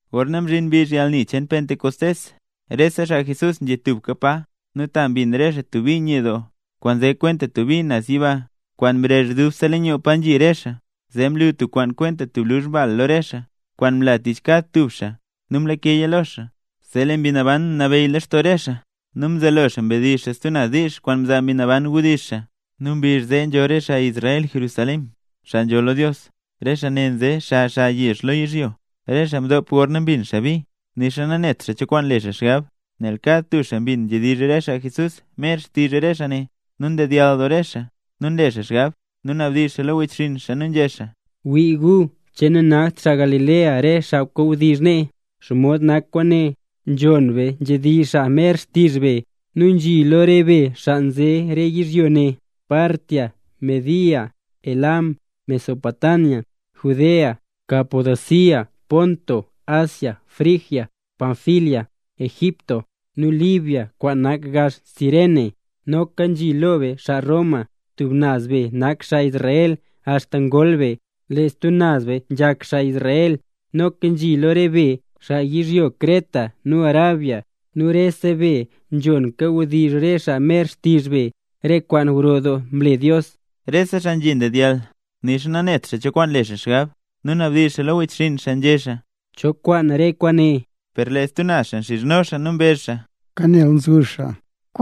Gorna mzhin mbizh yalni cheen Pentecostés, rese xaa Jesús nzhi tubka pa. Nu ta mbin re xaa tub bi nye doo, kwaan nze kwenta tub mbi naz yiba, kwaan mrezh dubse leen yoo pa nzhi re xaa. Zee mlu tub kwaan kwenta luzh bal lo re xaa, kwaan mla tich kad tub xaa nu mlakeya lo xaa. Zee lee Mbi Naban mnabeyy lextoo re xaa nu mzelo xaa mdizh xaa stub naz diizh, kwaan nzaa Mbi Naban mdizh xaa. Nu mbizh zee nzho re xaa Israel Jerusalén, xaa nzholl lo Dios, re xaa ne nze xa xa yezh lo yizhyo. Rese xaa mdop gorna mbin xaa bi, nixa nanet xaa cho kwaan le xaa xgab, nel kad tub xaa mbin nzhedizh re xaa Jesús mer xtizh re xaa ne. Nu ndedyall doo re xaa, nu nle xaa xgab, nu nabdizh xaa lo wechxinn xaa, nu nzhé xaa: —¡Wii gu! ¿Che nanakt xaa Galilea re xaa kawdizh nee? ¿Xomod nak kwaane? Nzhon be nzhedizh xaa mer xtizh be. Nu nzhi lo re be xaa nze re yizhyo ne: Partia, Media, Elam, Mesopotamia, Judea, Capadocia, Ponto, Asia, Frigia, Panfilia, Egipto nu Libia kwaan nak gax Cirene. Noka nzhi lo be xaa Roma. Tub naz be nak xaa Israel axta ngol be, lee stub naz be nzhak xaa Israel. Noka nzhi lo re be, xaa yizhyo Creta nu Arabia. Nu rese be nzhon kawdizh re xaa mer xtizh be, re kwaan gro doo mle Dios. Rese xaa nzhi ndedyall, nixa nanet xaa cho kwaan le xaa xgab, nu nabdizh xaa lo wechxinn xaa, nzhé xaa: —¿Cho kwaan re kwaane? Per lee stub naz xaa nxizhno xaa nu mbezh xaa: —¡Kan nel nzuzh xaa!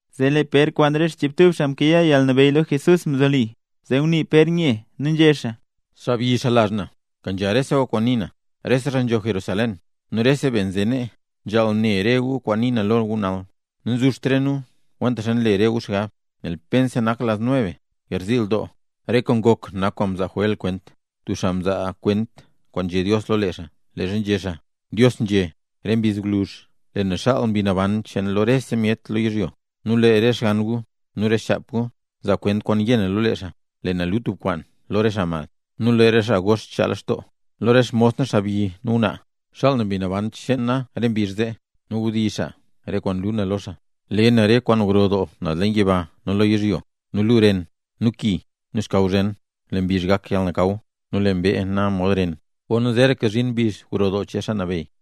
Zee lee Pér kwaan re xchiibtub xaa mkayaa yalnabeyy lo Jesús mzoli. Zee ngunii Pér nye, nu nzhé xaa: —Xaabyi, xaa lazh na, kenzha rese gu kwaan nii na. Rese xaa nzho naz Jerusalén nu rese be nze nee, nzhaal ne re gu kwaan nii na lo gu nal. Nanzuzht re nu kwentaxa nle re gu xgab, nel pensa nak las nueve, garziil doo. Re kwaan ngok nak kwaan mzaa Joél kwent, tub xaa mzaa kwent kwaan nzhé Dios lo lee xaa, leezha nzhé xaa: Dios nzhé: “Re mbizh gwluzh, lee na xaal Mbi Naban cheen na lo rese myet lo yizhyo. Nu lee re xgann gu nu re xchap gu, zaa kwent kwaan yé na lo lee xaa, le na luu tub kwaan lo re xaa mad, nu lee re xaa gox chaa lextoo. Lo re xmos na xaabyi nu ngwnaa, xaal na Mbi Naban cheen na re mbizh zee, nu wdizh xaa re kwaan luu na lo xaa. Le na re kwaan gro doo naz leen yiba nu lo yizhyo, nu luu ren, nu ki, nu xkaw zhen. Lee mbizh gak yalnakaw, nu lee mbee na mod ren, gorna zeeraka zhin mbizh gro doo cheen Xaa Nabeyy.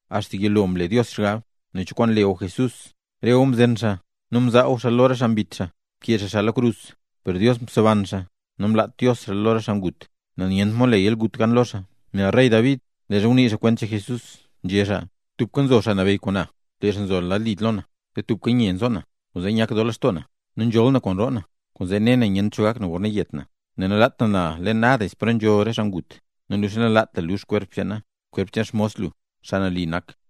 Axta yilo mlela Dios xgab nen cho kwaan le gu Jesús. Re gu mzen xaa nu mzaa gu xaa lo re xaa mbit xaa, mkee xaa xaa lo krus. Per Dios mseban xaa, namlaat Dios xaa lo re xaa ngut, nel nyent mod le yalgut gan lo xaa. Nel rey David leezha ngunii xaa kwent cheen Jesús, nzhé xaa: Tubka nzo Xaa Nabeyy kwaan na, lee xaa nzo lad li lo na, zee tubka nye nzo na. Kwaanzee nyak doo lextoo na, nu nzholl na kwaan roo na. Kwaanzee nela na nyent cho kwaan gak na gorna yet na, nel nalaat lu na leen Hades, pa nzho re xaa ngut, nu nixa nalaat lu lux kwerp cheen na, kwerp cheen xmos lu, Xaa Nali nak.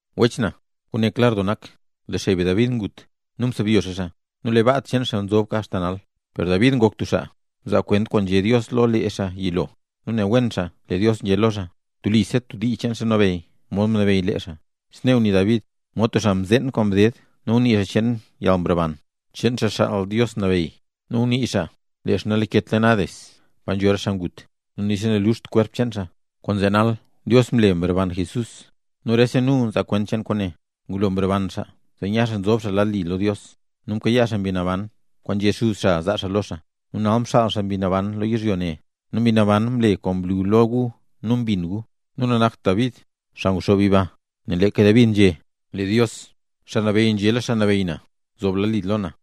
’Wech na, kwaane klar doo nak, lee xey be David ngut, nu ngubyo xaa, nu lee baa cheen xaa nzoka axta nal. Per David ngok tub xaa mzaa kwent kwaan nzhé Dios lo lee xaa yilo, nu ne wen xaa lee Dios nzhé lo xaa, telisa tub dii cheen xaa nabeyy mod mnabeyy lee xaa. Snee ngunii David, mod tub xaa mzeen kwaan ded, ngunii xaa cheen yalmroban cheen Xaa Xaal Dios Nabeyy, nu ngunii xaa lee xaa nalaket leen Hades, pa nzho re xaa ngut, nu nixa naluxt kwerp cheen xaa. Kwaanzee nal Dios mle mroban Jesús, nu rese nu nzaa kwent cheen kwaane. Ngulo mroban xaa zee nya xaa mzob xaa lad li lo Dios, nu mkayaa xaa Mbi Naban kwaan nzhé Xuz xaa zaa xaa lo xaa, nu nal mxaala xaa Mbi Naban lo yizhyo ne. Nu Mbi Naban mle kwaan mlu lo gu nu mbin gu. Nu nanakt David, xaa nguxoob yiba. Nel leeka David nzhé: Dios, Xaa Nabeyy rese kwaan, nzhé lo Xaa Nabeyy lo na: “Zob lad li lo na,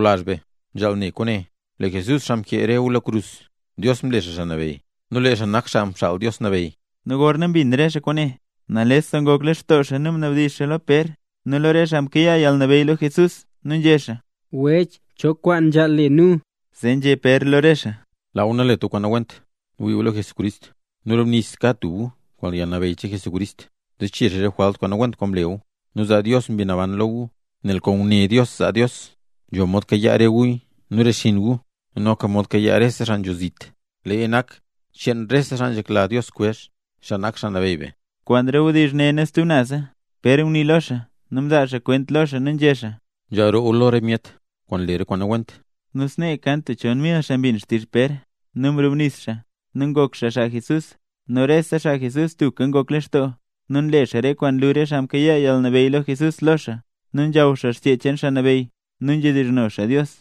’Sawlazh be, nzhaal ne kwaane: Lee Jesús, xaa mkee re gu lo krus, Dios mle xaa Xaa Nabeyy, nu lee xaa nak Xaa Mxaal Dios Nabeyy. Nu gorna mbin re xaa kwaane, nales ngok lextoo xaa nu mnabdizh xaa lo Pér nu lo re xaa mkayaa yalnabeyy lo Jesús, nu nzhé xaa: —Wech, ¿cho kwaan nzhaal le nu? Zee nzhé Pér lo re xaa: —Laa gu nalet gu kwaan nawent, nu wii gu lo Jesucrist, nu brubnis kad tub gu kwaan yalnabeyy cheen Jesucrist, zee chee xaa re jwalt kwaan nawent kwaan mle gu, nu zaa Dios Mbi Naban lo gu. Nel kwaan nguné Dios zaa Dios, nzho mod kayaa re gu nu re xinn gu, nu noka nzho mod kayaa rese xaa nzho zit. Leeya nak cheen rese xaa nzhekla Dios kwezh, xaa nak Xaa Nabeyy be. Kwaan re wdizh ne nu stub naza, Pér ngunii lo xaa, nu mzaa xaa kwent lo xaa nu nzhé xaa: —Nzhaal roo gu lo re myet kwaan nle re kwaan nawent. Nu snee kan tub chon mil xaa mbin xtizh Pér, nu mrubnis xaa, nu ngok xaa xaa Jesús. Nu rese xaa Jesús tubka ngok lextoo nu nle re xaa re kwaan nlu re xaa mkayaa yalnabeyy lo Jesús lo xaa, nu nzhaw xaa Xchee cheen Xaa Nabeyy, nu nzhedizhno xaa Dios.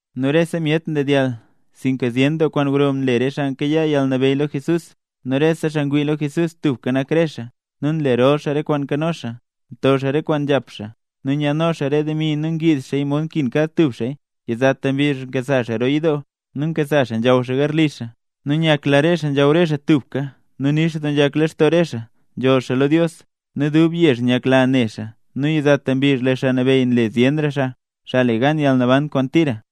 Nu rese myet mdedyall sinka zyen doo kwaan gro nle re xaa mkayaa yalnabeyy lo Jesús. Nu rese xaa ngwii lo Jesús tubka nak re xaa, nu nlerol xaa rese kwaan nkano xaa. Nto xaa re kwaan nzhap xaa nu nyaadno xaa re demi nu ngiiz xaaya mod nkin kad tub xaaya. Yizata mbizh nkasa xaa roo yidoo, nu nkasa xaa nzhaw xaa garli xaa, nu nyakla re xaa nzhaw re xaa tubka, nu nix doo nzhak lextoo re xaa. Nzholl xaa lo Dios, nu dubse yezh nyakla ne xaa. Nu yizata mbizh lee Xaa Nabeyy nle zyenra xaa, xaa le gan yalnaban kwaan tira.